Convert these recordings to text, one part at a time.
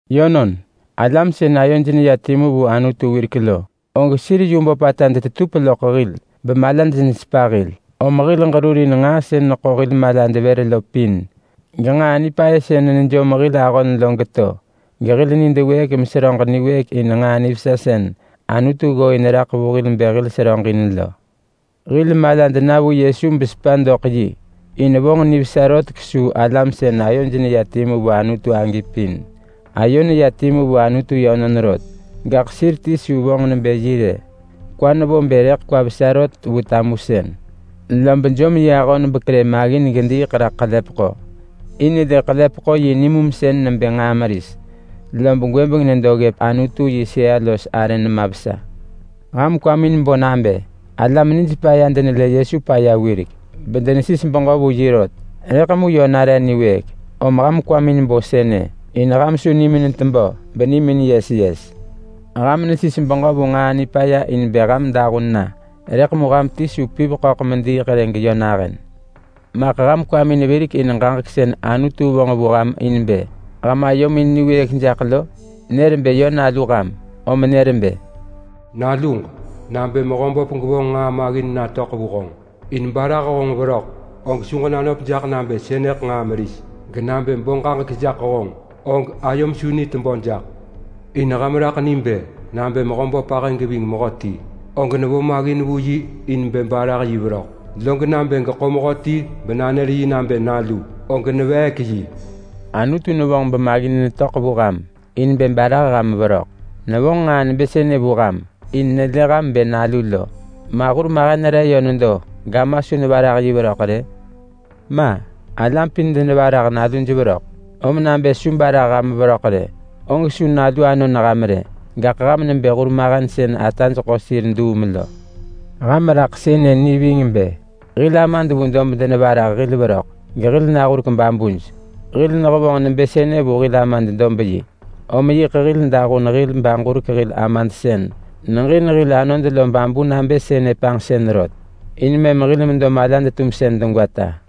Yönon, alam sën ayoj neya timu vu Anutu wirek lo, og sir yu böpata bemalaj nesepa hil. Om hil ġerurin nġaa sën neḳo hil malad vër lo pin, genġaa nipaya sën nejom hil ahon lo geto, gehil nid wëëk meseröġ niwëëk in nġaa nivesa sën Anutu ggooin raḳ vu hil bë hil seröġ in lo. Hil malad na vu Yesu besepa doḳ yi, in vonġ nivesa rot kesuu alam sën ayoj neya timu vu Anutu agi pin. Ayo neya timu vu Anutu yönon rot, gaḳ sir ti su vonġ nebë yi rë. Kwa nevo bë rëḳ kwa vesa rot vu tamusën, lob jom yi ahon bekerë maggin gediiḳ raḳ ḳelepeḳo, in lë ḳelepeḳo yi nimumsën nebë nġaa meris. Lob gwëbeng nedo ggëp Anutu yi sëa nema vesa. Ham kwamin bo nabë alam nij paya denelë Yesu paya wirek bedenesis beġö vu yi rot, rëḳ mu yö nare niwëëk. Om ham kwamin bo nabë sënë in ham su nimin tebö benimin yes yes. Ham nesis beġö vu nġaa nipaya in bë ham dahun na, rëḳ mu ham ti su piv ḳöḳ mediiḳ rë geyö nahën. Maḳ ham kwamin virek in ġaġek sën Anutu vonġ vu ham in bë ham ayomin niwëëk jaḳ lo? Nër bë yö nalu ham. Om nër bë: “Naluġ, nabë Mehöböp gevonġ nġaa maggin natöḳ vu honġ in barah honġ veröḳ og su ġenanöp jaḳ nabë sënëḳ nġaa meris. Genabë bo ġaġek jaḳ honġ, og ayom su ni tebö jaḳ. In ham raḳ ni bë: Nabë Mehöböp ahë geving mehöti, og nevo maggin vu yi in bë barah yi veröḳ, log nabë geḳo mehöti benanër yi nabë nalu, og neveek yi.” Anutu nevonġ bemaggin netöḳ vu ham in bë barah ham veröḳ. Nevonġ nġaa nebë sënë vu ham in nelë ham nebë nalu lo. Ma hurmahen re yö nedo gama su nevarah yi veröḳ rë? Ma! Alam pin denevarah naluj veröḳ. Om nabë su barah ham veröḳ rë, og su nalu anon ham rë, gaḳ ham nebë hurmahen sën ataj ḳo sir duum lo. Ham raḳ sënë ni ving bë: Hil amad vu dob denevarah hil veröḳ, gehil nahurek babuj. Hil nehevonġ nebë sënë vu hil amad dob-yi, om yiḳ hil dahun hil baġurek hil Amad sën neġin hil anod lo babu nabë sënë panġsën rot, in mëm hil medo malad-tumsën degwata.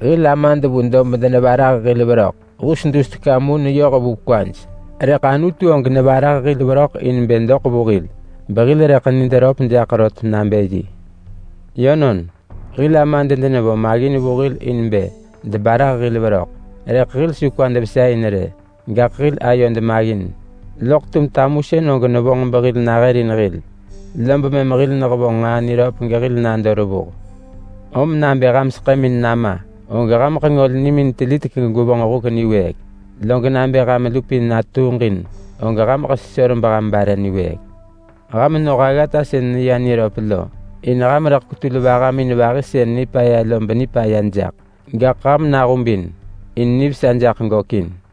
Hil amad vu dob denevarah hil veröḳ hus dus teka mu neyoh vu kwaj. Rëḳ Anutu og nevarah hil veröḳ in bë doḳ vu hil behil rëḳ nid röp jaḳ rot nabë yi. Yönon, hil amad denevo maggin vu hil in bë debarah hil veröḳ, rëḳ hil su kwad vesa in rë. Gaḳ hil ayod maggin loḳ tum tamusën og nevonġ behil nahërin hil, lob mëm hil nehevonġ nġaa niröp gehil nado revuh. Om nabë ham seḳëmin nama, og hameḳ ngol nimin telitek gegwevonġ huk niwëëk. Log nabë ham lupin natuuġin, og hameḳ ngol ham bebare niwëëk. Ham noh aggata sën neya niröp lo, in ham rëḳ kwetul vahamin vahi sën nipaya lo benipaya jaḳ. Gaḳ ham nahubin, in nivesa jaḳ gökin.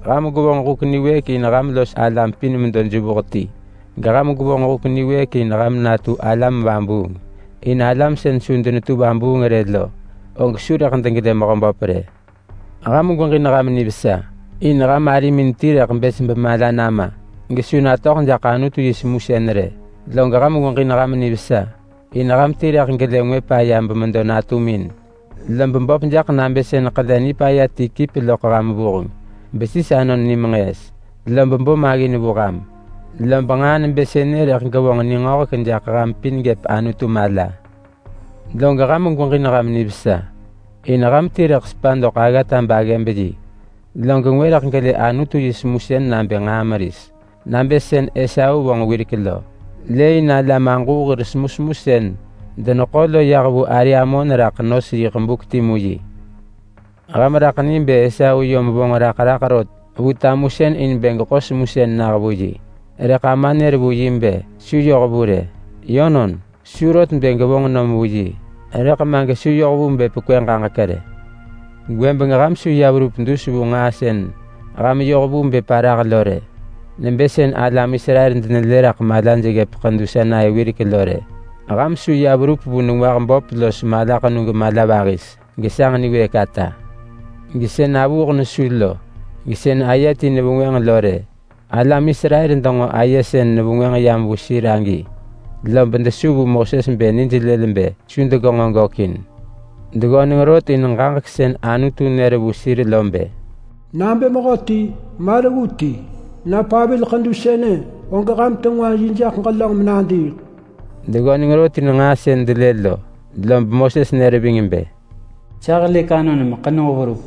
Ham gwevonġ huk niwëëk in ham los alam pin medo jevuh ti. Geham gwevonġ huk niwëëk in ham natu alam vabuung, in alam sën su denetu vabuung rë lo, og su rëḳ degelë Mehöböp rë. Ham gweġin ham nivesa, in ham arimin ti rëḳ bës bemala nama gesu natöḳ jaḳ Anutu yi semusën rë. Log ham gweġin ham nivesa in ham ti rëḳ gelë ngwë paya bemedo natumin, lob böp jaḳ nabë sën ḳele nipaya ti kip loḳ ham vuheng besis anon ni menġëës, lob bo maggin vu ham. Lob nġaa nebë sënë rëḳ gevonġ ningöhek jaḳ ham pin gëp Anutu mala. Log ham gweġin ham nivesa in ham ti rëḳ sepa doḳ aggata baggëb-yi, log ngwë rëḳ gelë Anutu yi semusën nabë nġaa meris, nabë sën Esau vonġ wirek lo. Lëëin semusemu sën alam aġuu deneḳo lo yah raḳ ari amon in nos yiḳ buk timu yi. Ham raḳ ni bë Esau yom vonġ raḳ raḳ rot vu tamusën in bë geḳo semusën nah vu yi, rëḳ ama nër bë su yoh vu rë. Yönon, su rot bë gevonġ nom vu yi, rëḳ ma gesu yoh vu bë pekwë ġaġek rë. Gwëbeng ham su verup ya nedo dus vu nġaa sën ham yoh vu bë parah lo rë, nebë sën alam Israel denelë raḳ malaj ggëp ḳedu Sinai wirek lo. Ham su ya verup vu nengwah böp los malaḳenu gemala vahis, gesanġ niwëëk ata, gesën avuuḳ nesu lo, gesën aye ti nevengwënġ lo rë. Alam Israel denġo aye sën nevengwënġ yam vu sir agi, lob desu vu Moses bë nij lël bë su degenġo gökin. Deggöneng rot in ġaġek sën Anutu nër vu sir lo bë, “Nabë mehöti, ma reggu ti, na pavil ḳedu sënë, og ham tengwa yi jaḳ ġelönġ menadiiḳ.” Deggöneng rot in nġaa sën delë lo, lob Moses nër ving bë, “Sa helëk anon meḳenug verup.”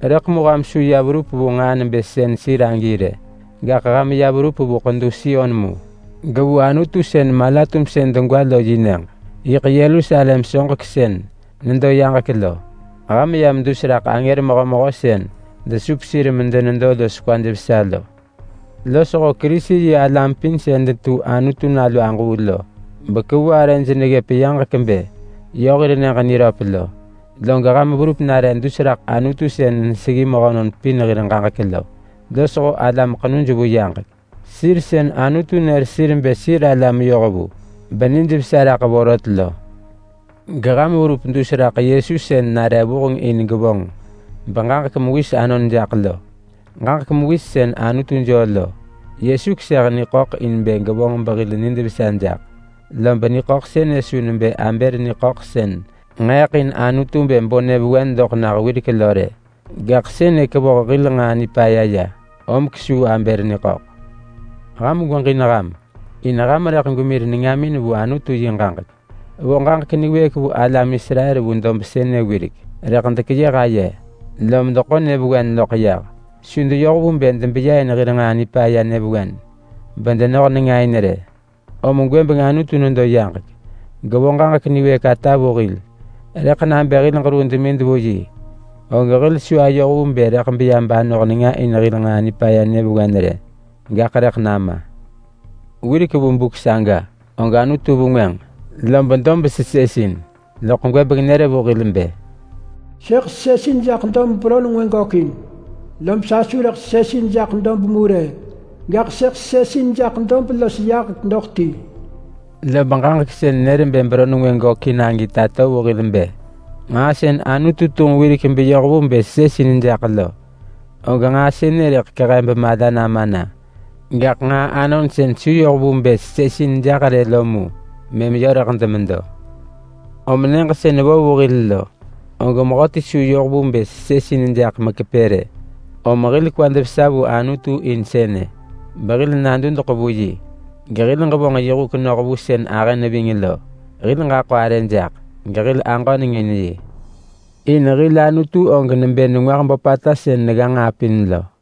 Rëḳ mu ham su ya verup vu nġaa nebë sën sir agi rë. Gaḳ ham ya verup vu ḳedu Sion mu, gevu Anutu sën mala-tumsën degwa lo yi nyëġ. Yiḳ Yerusalem soġek sën nedo vu yaġek lo. Ham yam dus raḳ angër mehömehö sën desup sir medenedo los kwaj vesa lo, losho Kerisi-yi-alam pin sën detu Anutu nalu aġuu bekevu arëj neggëp yaġek bë yö hir nyëġ niröp lo. Log ham verup nare dus raḳ Anutu sën neseggi mehönon pin hir ġaġek lo, losho alam ḳenuj vu yaġek. Sir sën Anutu nër sir bë sir alam yohvu benijvesa raḳ vorot lo. Geham verup dus raḳ Yesu sën nare vuheng in gevonġ beġaġek mewis anon jaḳ lo. Ġaġek mewis sën Anutu joo lo. Yesu keseh niḳöḳ in bë gevonġ behil nid vesa jaḳ. Lob niḳöḳ sënë su nebë Abel niḳöḳ sën nġeeḳ in Anutu bë bo nyëvewen doḳ nah wirek lo rë. Gaḳ sënë kevoh hil nġaa nipaya ya, om kesuu. Ham gweġin ham! In ham rëḳ gwemir nengamin vu Anutu yi ġaġek. Vo ġaġek niwëëk vu alam Israel vu dob sënë wirek, rëḳ dekeyëh aye, lom deḳo nyëvewen loḳ yah. Su deyoh vu bë debeya in hir nġaa nipaya nyëvewen bedenoh nenga in rë. Om gwëbeng Anutu nedo yaġek gevo ġaġek niwëëk ata vu hil. Rëḳ nabë hil ġeruu demid vu yi, og hil su ayoh vu bë rëḳ beya banoh nenga in hil nġaa nipaya nyëvewen rë, gaḳ rëḳ nama. Wirek vu buk saga, og Anutu vengwënġ, lob dob sesësin. Loḳ gwëbeng nër vu hil bë, “Sëḳ sesësin jaḳ dob beron ngwë gökin. Lob sa su rëḳ sesësin jaḳ dob mu rë, gaḳ sëḳ sesësin jaḳ dob los yaġek doḳ ti.” Lob ġaġek sën nër bë beron ngwë gökin agi tato vu hil bë: Nġaa sën Anutu tunġ wirek beyoh vu bë sesësin jaḳ lo, og nġaa sënë rëḳ kehe bemala nama na. Gaḳ nġaa anon sën su yoh vu bë sesësin jaḳ rë lo mu mëm yö rëḳ demedo. Om nyëġ sën vo vu hil lo, og mehöti su yoh vu bë sesësin jaḳ mekepë rë. Om hil kwad vesa vu Anutu in sënë, behil nadudeḳ vu yi, gehil ġevonġ yi huk noh vu sën ahë neving lo. Hil ġaḳo arë jaḳ gehil aġöneng in yi. In hil Anutu og nebë nengwah böpata sën negga nġaa pin lo.